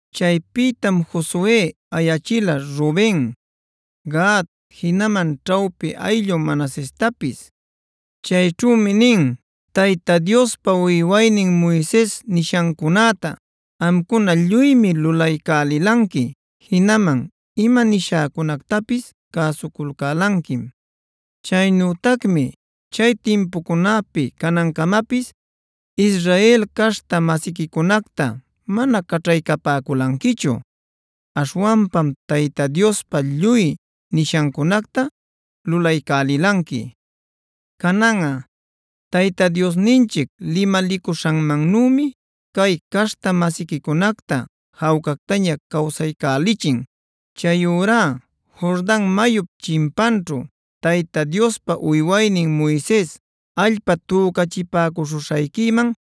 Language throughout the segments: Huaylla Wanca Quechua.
Chaypïtam Josue ayachila Ruben, Gad jinaman ćhawpi ayllu Manasestapis. Chayćhümi nin: “Tayta Diospa uywaynin Moises nishancunäta amcuna lluymi lulaycälilanqui. Jinaman ima nishäcunactapis cäsuculcälanquim. Chaynütacmi chay timpucunapi canancamapis Israel caśhta-masiquicunacta mana caćhaycapäculanquichu. Aśhwanpam Tayta Diospa lluy nishancunacta lulaycälilanqui. Cananꞌa Tayta Diosninchic limalicuśhanmannümi cay caśhta-masiquicunacta jawcactaña cawsaycälichin. Chayurá Jordan mayup chimpanćhu Tayta Diospa uywaynin Moises allpa tücachipäcuśhuśhayquiman,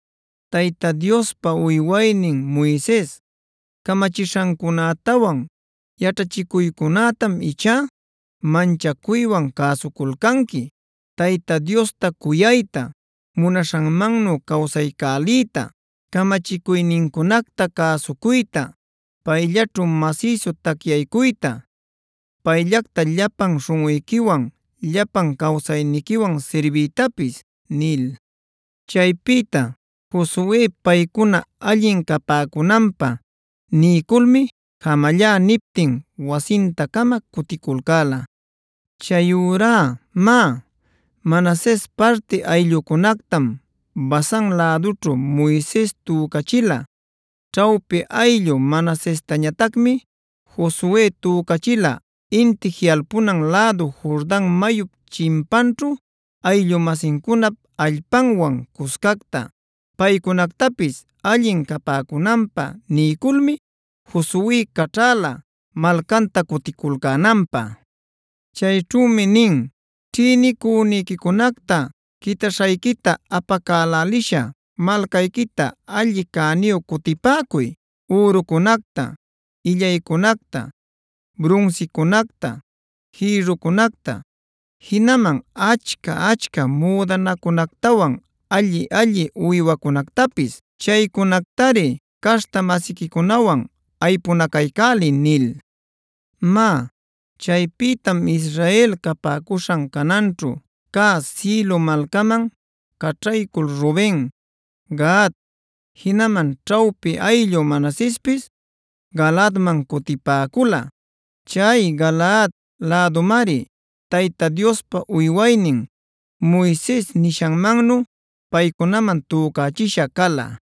Tayta Diospa uywaynin Moises camachishancunätawan yaćhachicuycunätam ichá manchacuywan cäsuculcanqui: Tayta Diosta cuyayta, munaśhanmannu cawsaycäliyta, camachicuynincunacta cäsucuyta, payllaćhu masïsu tacyaycuyta, payllacta llapan śhunꞌuyquiwan llapan cawsayniquiwan sirbiytapis” nil. Chaypïta Josue paycuna allin capäcunanpä niyculmi jamallá niptin wasinta-cama cuticulcäla. Chayurá má, Manases parti ayllucunactam Basan lädućhu Moises tücachila. Ćhawpi ayllu Manasestañatacmi Josue tücachila inti jiꞌalpunan lädu Jordan mayup chimpanćhu ayllu-masincunap allpanwan cuscacta. Paycunactapis allin capäcunanpä niyculmi Josue caćhäla malcanta cuticulcänanpä. Chayćhümi nin: “Ćhïnicüniquicunacta quitaśhayquita apacälälisha malcayquita alli cäniyu cutipäcuy: ürucunacta, illaycunacta, brunsicunacta, jïrrucunacta, jinaman achca-achca müdanacunactawan alli-alli uywacunactapis. Chaycunactari caśhta-masiquicunawan aypunacaycäliy” nil. Má, chaypïtam Israel capäcuśhan Canaanćhu cä Silo malcaman caćhaycul Ruben, Gad, jinaman ćhawpi ayllu Manasespis Galaadman cutipäcula. Chay Galaad lädumari Tayta Diospa uywaynin Moises nishanmannu paycunaman tücachisha cala.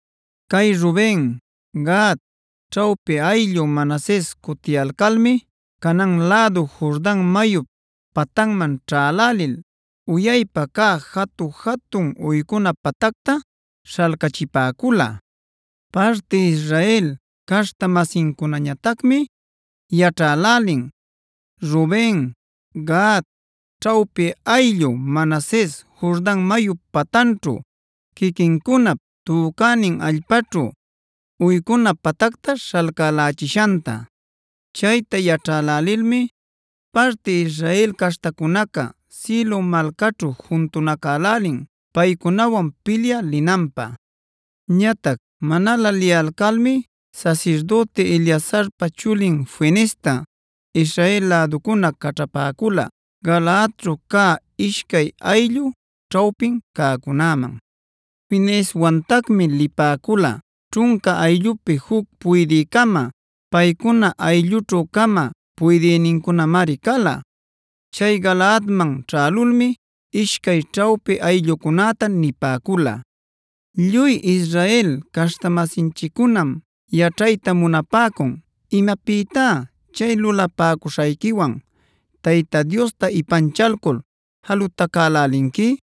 Cay Ruben, Gad, ćhawpi ayllu Manases cutiyalcalmi Canaan lädu Jordan mayup patanman ćhälälil uyaypa cä jatu-jatun uycuna patacta śhalcachipäcula. Parti Israel caśhta-masincunañatacmi yaćhälälin Ruben, Gad, ćhawpi ayllu Manases Jordan mayup patanćhu, quiquincunap tücänin allpaćhu uycuna patacta śhalcälächishanta. Chayta yaćhälälilmi parti Israel caśhtacunaca Silo malcaćhu juntunacälälin paycunawan pilyä linanpä. Ñatac manalä liyalcalmi sasirdüti Eleazarpa chulin Fineesta Israel läducuna caćhapäcula Galaadćhu cä ishcay ayllu ćhawpin cäcunäman. Fineeswantacmi lipäcula ćhunca ayllupi juc puydï-cama; paycuna ayllućhu-cama puydïnincunamari cala. Chay Galaadman ćhälulmi ishcay ćhawpi ayllucunäta nipäcula: “Lluy Israel caśhta-masinchiccunam yaćhayta munapäcun. ¿Imapïtá chay lulapäcuśhayquiwan Tayta Diosta ipanchalcul jalutacälälinqui?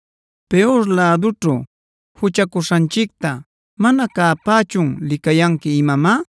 ¿Peor lädućhu juchacuśhanchicta mana cäpächun licayanqui imamá?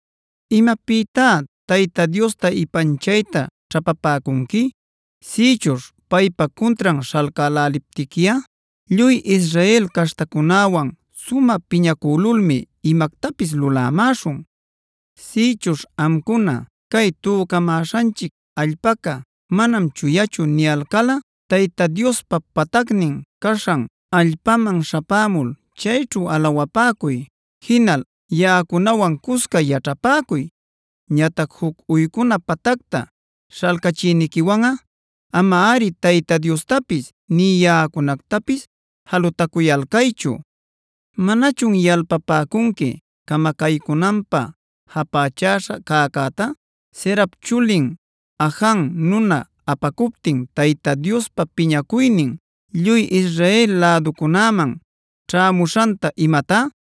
¿Imapïtá Tayta Diosta ipanchayta ćhapapäcunqui? Sïchuśh paypa cuntran śhalcäläliptiquiꞌa lluy Israel caśhtacunäwan sumä piñacülulmi imactapis lulämäśhun. Sïchuśh amcuna: ‘Cay tücamäśhanchic allpaca manam chuyachu’ niyalcalꞌa Tayta Diospa patacnin caśhan allpaman śhapämul chayćhu alawapäcuy. Jinal yaꞌacunawan cusca yaćhapäcuy. Ñatac juc uycuna patacta śhalcachïniquiwanꞌa amari Tayta Diostapis nï yaꞌacunactapis jalutacuyalcaychu. ¿Manachun yalpapäcunqui camacaycunanpä japächäśha cäcäta Zerap chulin Ajan nuna apacuptin Tayta Diospa piñacuynin lluy Israel läducunäman ćhämuśhanta imatá?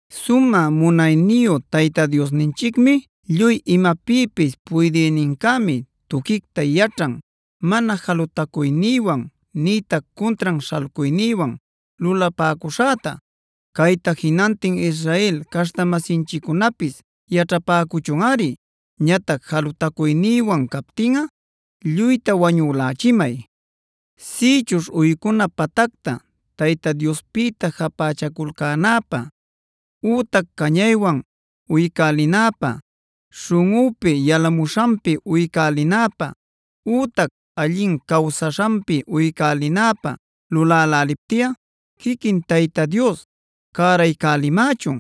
“Sumä munayniyu Tayta Diosninchicmi, lluy imapïpis puydïnincämi tuquicta yaćhan mana jalutacuynïwan nïtac cuntran śhalcuynïwan lulapäcuśhäta. Cayta jinantin Israel caśhta-masinchiccunapis yaćhapäcuchunꞌari. Ñatac jalutacuynïwan captinꞌa lluyta wañülächimay. Sïchuśh uycuna patacta Tayta Diospïta japächaculcänäpä, ütac cañaywan uycälinäpä, śhunꞌüpi yalamuśhanpi uycälinäpä, ütac allin cawsaśhanpi uycälinäpä luläläliptiꞌa quiquin Tayta Dios cäraycälimächun.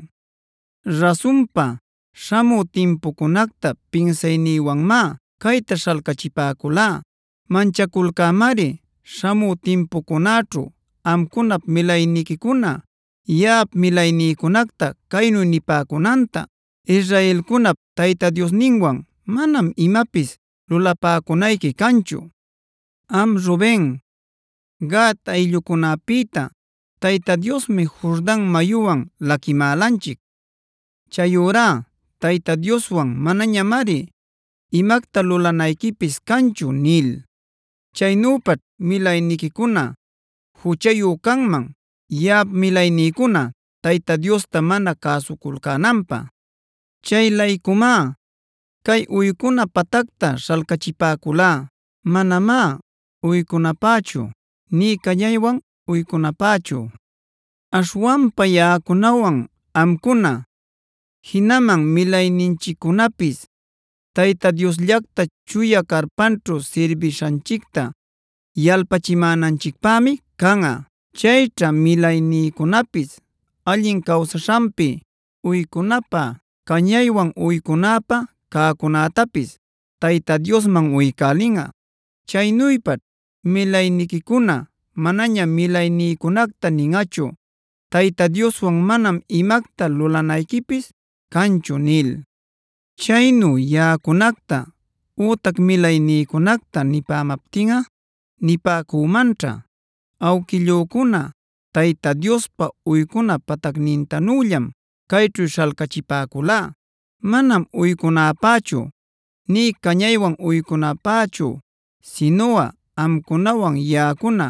Rasunpa, śhamü timpucunacta pinsaynïwanmá cayta śhalcachipäculá. Manchaculcämari śhamü timpucunäćhu amcunap milayniquicuna yaꞌap milaynïcunacta caynu nipäcunanta: ‘Israelcunap Tayta Diosninwan manam imapis lulapäcunayqui canchu. Am Ruben, Gad ayllucunapïta Tayta Diosmi Jordan mayuwan laquimälanchic. Chayurá Tayta Dioswan manañamari imacta lulanayquipis canchu’ nil. Chaynüpaćh milayniquicuna juchayu canman yaꞌap milaynïcuna Tayta Diosta mana cäsuculcänanpä. “Chay-laycumá cay uycuna patacta śhalcachipäculá, manamá uycunapächu nï cañaywan uycunapächu. Aśhwanpa yaꞌacunawan amcuna, jinaman milayninchiccunapis Tayta Diosllacta chuya carpanćhu sirbishanchicta yalpachimänanchicpämi canꞌa. Chayćha milaynïcunapis allin cawsaśhanpi, uycunapä, cañaywan uycunapä cäcunätapis Tayta Diosman uycälinꞌa. Chaynüpaćh milayniquicuna manaña milaynïcunacta ninꞌachu: ‘Tayta Dioswan manam imacta lulanayquipis canchu’ nil. Chaynu yaꞌacunacta ütac milaynïcunacta nipämaptinꞌa nipäcümanćha: ‘Awquillücuna Tayta Diospa uycuna patacnintanüllam cayćhu śhalcachipäculá. Manam uycunapächu nï cañaywan uycunapächu, sinuꞌa amcunawan yaꞌacuna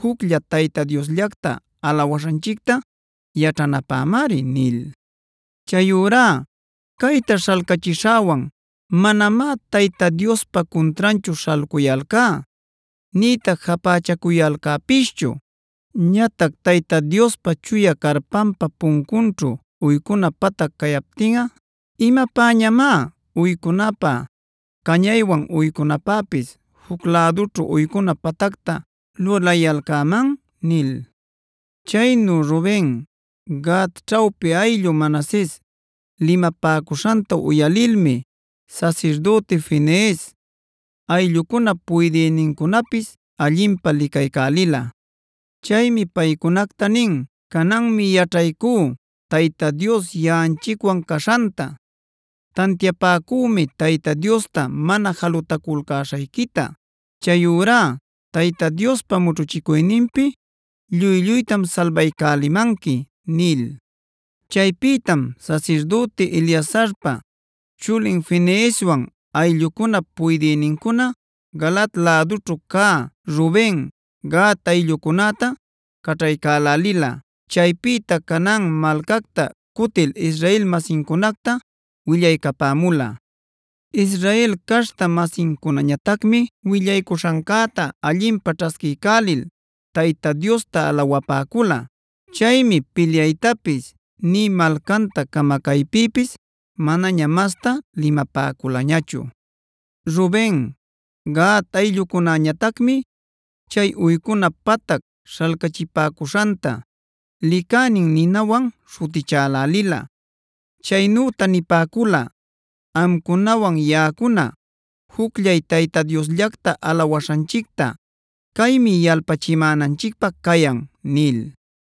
jucllay Tayta Diosllacta alawaśhanchicta yaćhanapämari’ nil. Chayurá cayta śhalcachishäwan manamá Tayta Diospa cuntranchu śhalcuyalcá nïtac japächacuyalcäpischu. Ñatac Tayta Diospa chuya carpanpa puncunćhu uycuna patac cayaptinꞌa, ¿imapäñamá uycunapä, cañaywan uycunapäpis juc lädućhu uycuna patacta lulayalcäman?” nil. Chaynu Ruben, Gad ćhawpi ayllu Manases limapäcuśhanta uyalilmi sasirdüti Finees, ayllucunap puydïnincunapis allinpä licaycälila. Chaymi paycunacta nin: “Cananmi yaćhaycú Tayta Dios yaꞌanchicwan caśhanta. Tantiapacümi Tayta Diosta mana jalutaculcäśhayquita. Chayurá Tayta Diospa mućhuchicuyninpi lluy-lluytam salbaycälimanqui” nil. Chaypïtam sasirdüti Eleazarpa chulin Fineeswan ayllucunap puydïnincuna Galaad lädućhu cä Ruben, Gad ayllucunäta caćhaycälälila. Chaypïta Canaan malcacta cutil Israel-masincunacta willaycapämula. Israel caśhta-masincunañatacmi willaycuśhancäta allinpä ćhasquiycälil Tayta Diosta alawapäcula. Chaymi pilyaytapis nï malcanta camacaypïpis manaña mastá limapäculañachu. Ruben, Gad ayllucunäñatacmi chay uycuna patac śhalcachipäcuśhanta “Licänin” nïwan śhutichälälila. Chaynüta nipäcula: “Amcunawan yaꞌacuna jucllay Tayta Diosllacta alawaśhanchicta caymi yalpachimänanchicpä cayan” nil.